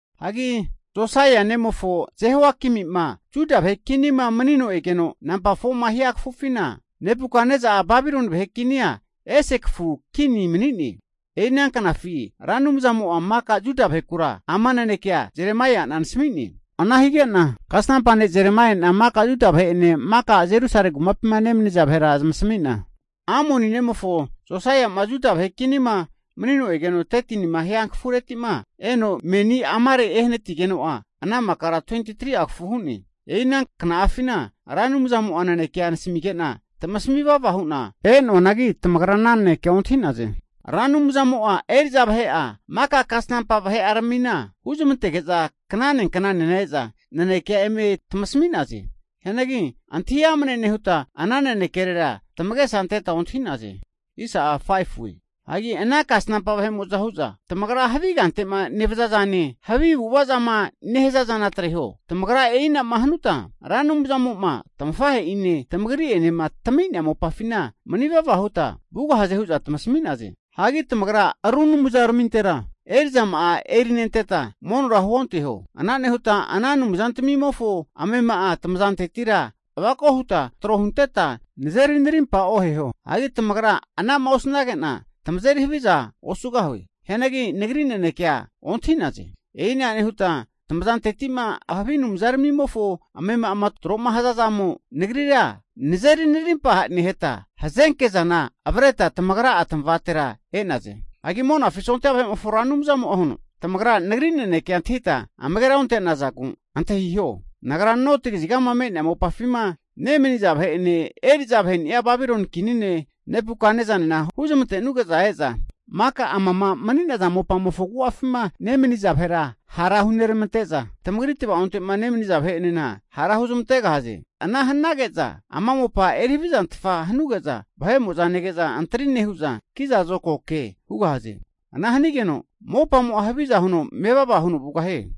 Hagi Josaia nemofo Jehoiakimi'ma Juda vahe kinima manino egeno nampa 4ma hia kafufina, Nebukatnesa'a Babiloni vahe kinia ese kafu kinia mani'ne. E'i ana knafi Ra Anumzamo'a maka Juda vahekura ama nanekea Jeremaia'na nasami'ne. Ana hige'na kasnampa ne' Jeremaiana maka Juda vahe'ene maka Jerusalemi kumapima nemaniza vahera zamasami'na, Amoni nemofo Josaia'ma Juda vahe kinima manino egeno 13nima hia kafureti'ma, eno meni amare ehanatigeno'a ana makara 23'a kafu hu'ne. E'i ana kna'afina Ra Anumzamo'a nanekea nasamige'na tamasami vava hu'na e'noanagi, tamagra ana nanekea ontahi'naze. Ra Anumzamo'a eri'za vahe'a maka kasnampa vahe'aramina huzmantege'za knane knanena e'za nanekea eme tamasami'naze. Hianagi antahi amne nehuta, ana nanekerera tamagesa anteta ontahi'naze. Hagi ana kasnampa vahe'mo'za hu'za, tamagra havi kante'ma nevaza zane, havi avu'ava zama nehaza zana atreho. Tamagra e'ina'ma hanuta, Ra Anumzamo'ma tamafahe'ine tamagri'enema tami'nea mopafina mani vava huta vugahaze hu'za tamasami'naze. Hagi tamagra ru anumzaramintera eri'zama'a eri nenteta monora huonteho. Ana nehuta ana anumzantamimofo amema'a tamazantetira avako huta tro hunteta nazeri narimpa oheho. Hagi tamagra anama osnage'na tamazeri havizana osugahue. Hianagi Nagri nanekea ontahi'naze. E'ina nehuta tamazanteti'ma havi anumza ramimofo amema'ama tro'ma haza zamo, Nagrira nazeri narimpa neheta, hazenke zana avreta tamagra'a tamavatera e'naze. Hagi Monafi sondia vahe'mofo Ra Anumzamo'a huno, Tamagra Nagri nanekea antahita amagera onte'nazagu, antahiho! Nagra noti kazigama me'nea mopafima nemaniza vahe'ene eri'za vaheni'a Babiloni kini ne' Nebukatnesanena huzmantenuge'za e'za maka amama mani'naza mopamofo agu'afima nemaniza vahera hara huneramante'za, tamagri tavaonte'ma nemaniza vahe'enena hara huzamantegahaze. Ana hanage'na ama mopa eri havizantfa hanuge'za vahe'mo'za nege'za antari nehu'za kiza zokago ke hugahaze. Ana hanigeno mopamo'a haviza huno mevava huno vugahie.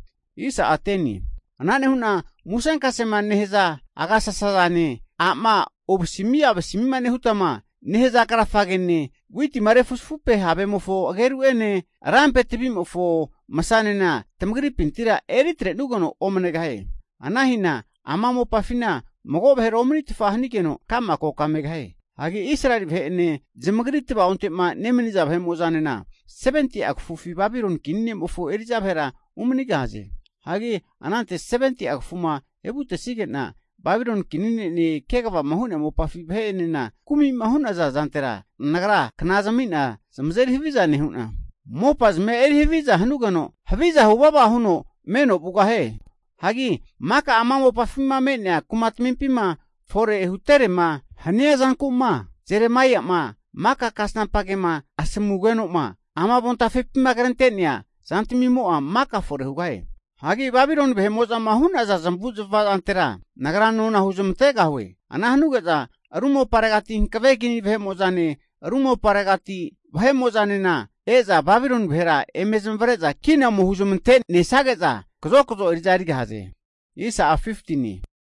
Ana nehu'na musenkasema nehaza agasasazane a'ma ovasimi avasimima nehutama nehaza krafagene witima refuzafupe havemofo ageru'ene lampe tavimofo masanena tamagripintira eri atrenugeno omanegahie. Ana hina ama mopafina mago vahera omanitfa hanigeno kama koka megahie. Hagi Israeli vahe'ene zamagri tavaonte'ma nemaniza vahemo'zanena 70'a kafufi Babiloni kini nemofo eri'za vahera umanigahaze. Hagi anante 70'a kafuma evutesige'na Babiloni kini ne'ene kegavama hu'nea mopafi vahe'enena kumi'ma hunaza zantera Nagra kna zami'na zamazeri haviza nehu'na mopazmia eri haviza hanugeno haviza huvava huno meno vugahie. Hagi maka ama mopafima me'nea kumatamimpima fore huterema hania zanku'ma, Jeremaia'ma maka kasnampa kema asamugeno ama avontafepima krente'nea zantamimo'a maka fore hugahie. Hagi Babiloni vahe'mo'zama hu'naza zamavu'zmava zantera Nagra nona huzamantegahue. Ana hanuge'za ru moparegati hankave kini vahe'mo'zane ru moparegati vahe'mo'zanena e'za Babiloni vahera eme zamavare'za kina ome huzamante nesage'za kazokazo eri'za erigahaze.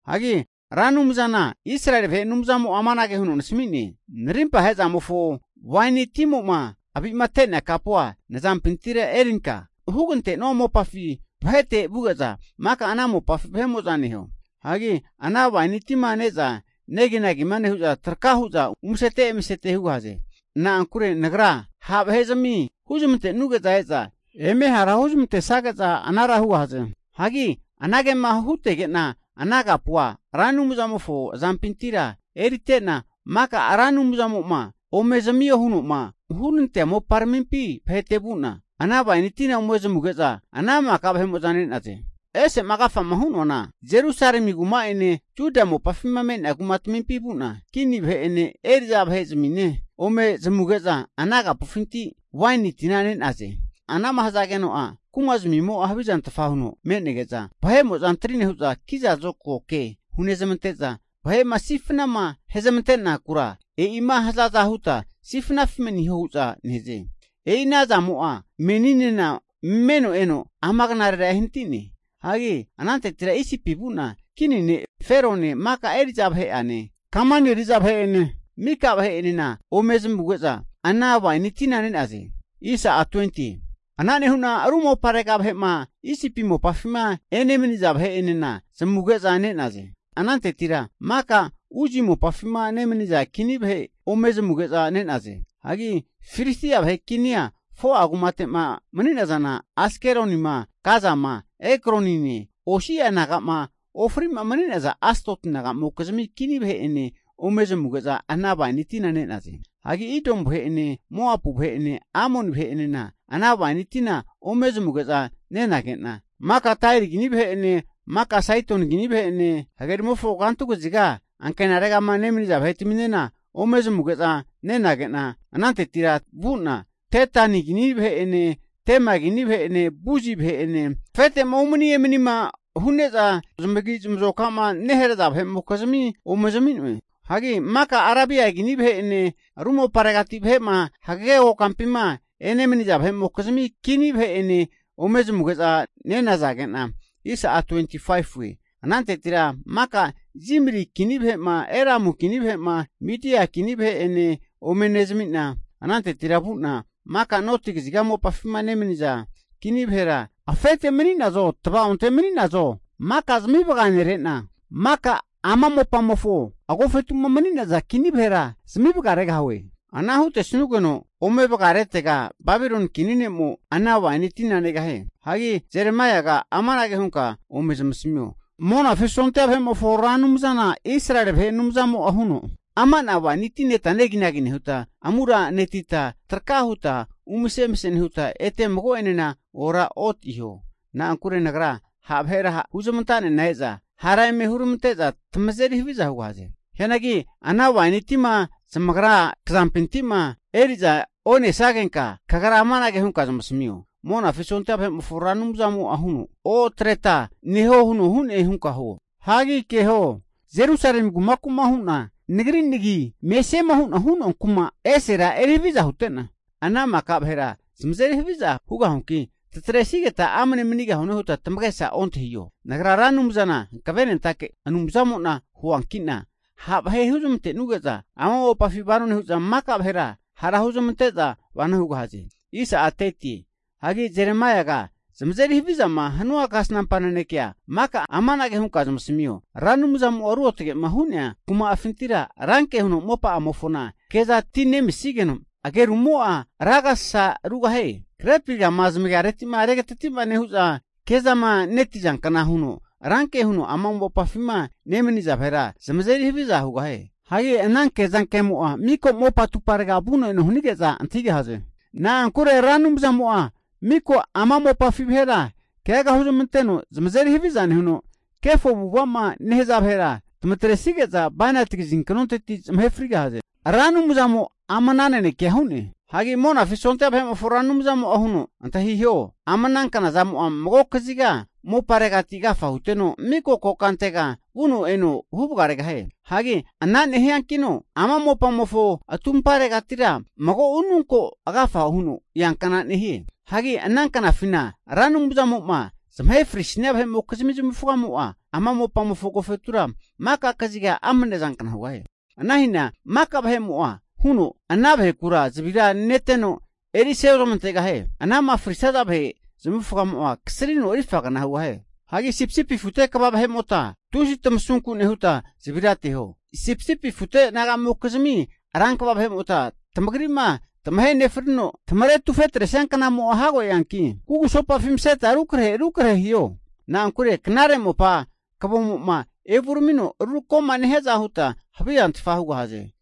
Hagi Ra Anumzana Israeli vahe Anumzamo'a amanage huno nasami'ne. Narimpa ahe'zamofo waini timoma avite'nea kapua nazampintira erinka, hugante'nua mopafi vahete vuge'za maka ana mopafi vahe'mo'za neho. Hagi ana waini tima ne'za neginagima nehu'za traka hu'za umasete emasete hugahaze. Na'ankure Nagra ha' vahe'zami huzmantenuge'za e'za eme hara huzmantesage'za anara hugahaze. Hagi anagema hutege'na ana kapua Ra Anumzamofo azampintira erite'na, maka Ra Anumzamo'ma ome zamio huno'ma hunantea moparamimpi vahete vu'na ana waini tina ome zamuge'za ana maka vahe'mo'za ne'naze. Hagi ese'ma agafa hu'noana Jerusalemi kuma'ene Juda mopafima me'nea kumatamimpi vu'na kini vahe'ene eri'za vahe'zamine ome zamuge'za ana kapufinti waini tina ne'naze. Ana'ma hazageno'a kumazmimo'a havizantfa huno me'nege'za, vahe'mo'za antri nehu'za kiza zokago ke hunezmante'za, vahe'ma sifnama huzmante'nakura e'ima hazaza huta sifnafi maniho hu'za nehaze. E'i ana zamo'a meninena meno eno ama knarera ehanati'ne. Hagi anantetira Isipi vu'na, kini ne' Ferone mika eri'za vahe'ane, kamani eri'za vahe'ene mika vahe'enena ome zamuge'za ana waini tina ne'naze. Ana nehu'na ru moparega vahe'ma Isipi mopafima enemaniza vahe'enena zamuge'za ne'naze. Anantetira maka Uzi mopafima nemaniza kini vahe ome zamuge'za ne'naze. Hagi Filistia vahe kinia 4'a kumate'ma mani'nazana, Askelonima, Gazama, Ekronine osi'a naga'ma ofri'ma mani'naza Asdoti naga'mokizimi kini vahe'ene ome zamuge'za ana waini tina ne'naze. Hagi Idomu vahe'ene Moapu vahe'ene Amoni vahe'enena ana waini tina ome zamuge'za nenage'na, maka Tairi kini vahe'ene maka Saidoni kini vahe'ene hagerimofo kantu kaziga ankenaregama nemaniza vahetaminena ome zamuge'za nenage'na, anantetira vu'na Dedani kini vahe'ene Tema kini vahe'ene Buzi vahe'ene afete'ma umani emanima hu'neza zamagi zamazokama neharaza vahe'mokizmi ome zami'noe. Hagi maka Arabia kini vahe'ene ru moparegati vahe'ma hagege kokampima enemaniza vahe'mokizmi kini vahe'enena ome zamuge'za nenazage'na, anantetira maka Zimri kini vahe'ma Elamu kini vahe'ma, Midia kini vahe'ene ome nezami'na, anantetira vu'na maka noti kaziga mopafima nemaniza kini vahera, afete mani'nazo tvaonte mani'nazo, maka zami vaganere'na, maka ama mopamofo agofetu'ma mani'naza kini vahera zami vagaregahue. Ana hutesanugeno ome vagaretega Babiloni kini ne'mo ana waini tina negahie. Hagi Jeremaiaga amanage hunka ome zamasamio. Monafi sondia vahe'mofo Ra Anumzana Israeli vahe Anumzamo'a huno, ama ana waini tina neta neginagi nehuta, amuranetita traka huta umase emase nehuta ete mago'enena oraotiho. Na'ankure Nagra ha' vahera huzmanta'nena e'za, hara eme huramante'za tamazeri haviza hugahaze. Hianagi ana waini tima zamagra kazampinti'ma eri'za onesagenka, kagra amanage hunka zamasamio. Monafi sondia vahe'mofo Ra Anumzamo'a huno, Otreta neho huno hu'ne hunka huo. Hagi keho! Jerusalemi kumaku'ma hu'na Nagri nagima mesiema hu'na hu'noa kuma esera eri haviza hute'na, ana maka vahera zamazeri haviza hugahuanki tatresigeta amne manigahune huta tamagesa ontahiho. Nagra Ra Anumzana hankavenentake Anumzamo'na huanki'na, ha' vahe huzmantenuge'za ama mopafina vano nehu'za maka vahera hara huzamante'za vano hugahaze. Hagi Jeremaiaga zamazeri havizama hanua kasnampa nanekea maka amanage hunka zamasamio. Ra Anumzamo'a ruotage'ma hu'nea kuma'afintira ranke huno mopa'amofona ke'za tinemisigeno ageru'amo'a ra agasasa rugahie. Grepi rgama zamagareti'ma regatati'ma nehu'za, kezama netizankna huno ranke huno ama mopafima nemaniza vahera zamazeri haviza hugahie. Hagi ana kezankemo'a, mika mopa atuparega vuno eno hanige'za antahigahaze. Na'ankure Ra Anumzamo'a miko ama mopafi vahera keaga huzmanteno zamazeri haviza nehuno, kefo avu'ava'ma nehaza vahera tamatresige'za bainati kazinknonteti zamahe frigahaze. Ra Anumzamo ama ana nanekea hu'ne. Hagi Monafi sondia vahe'mofo Ra Anumzamo'a huno, Antahiho, ama ana knazamo'a mago kaziga mopareti agafa huteno, miko kokantega vuno eno huvagaregahie. Hagi ana nehiankino ama mopamofo atumparegati mago ununko agafa huno eankna nehie. Hagi ana knafina Ra Anumzamo'ma zamahe frisia vahe'mokizmi zamavufagamo'a ama mopamofo agofetura maka kaziga amne zankna hugahie. Ana hina mago vahemo'e huno ana vahekura zavira neteno erise ozamantegahie. Anama frisaza vahe zamavufagamo'a kasrino rifagna hugahie. Hagi sipisipi afute kva vahe'mota tusi tamasunku nehuta zavira ateho. Sipisipi afu nagamokizmi rankva vahe'mota tamagri'ma tamahe nefrino tamare tufetresia knamo'a hago eanki, kugusopafi maseta rukrahe krahe hiho. Na'ankure knare mopa kavomo'ma evuramino rutako'ma nehiaza huta havizantfa hugahaze.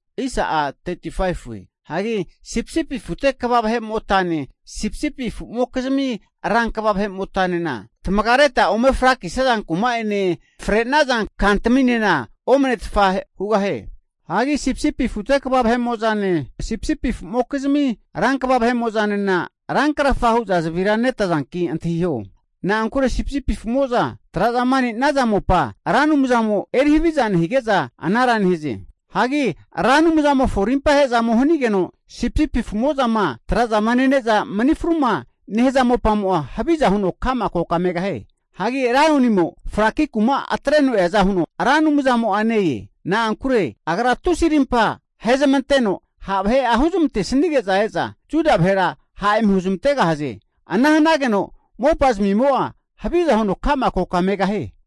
Hagi sipisipi afute kva vahe'motane, sipisipi afumokizmi rankva vahe'motanema tamagareta ome frakisaza kuma'ene, fre'naza kantaminena omanetfa hugahie. Hagi sipisipi afute kva vahemo'zane, sipisipi afumokizmi rankva vahemo'zanena rankrafa hu'za zavira netazanki antahiho. Na'ankure sipisipi afu'mo'zama trazama nenaza mopa Ra Anumzamo'a eri haviza nehige'za anara nehaze. Hagi Ra Anumzamofo arimpa ahe'zamo hanigeno, sipisipi afu'mo'zama trazama nene'za mani fruma nehaza mopamo'a haviza huno ka'ma koka megahie. Hagi laionimo fraki kuma'a atreno eaza huno Ra Anumzamo'a ne-e. Na'ankure Agra tusi arimpa ahezmanteno ha' vahe huzmantesanige'za e'za Juda vahera ha' eme huzmantegahaze. Ana hanageno mopa zamimo'a haviza huno ka'ma koka megahie.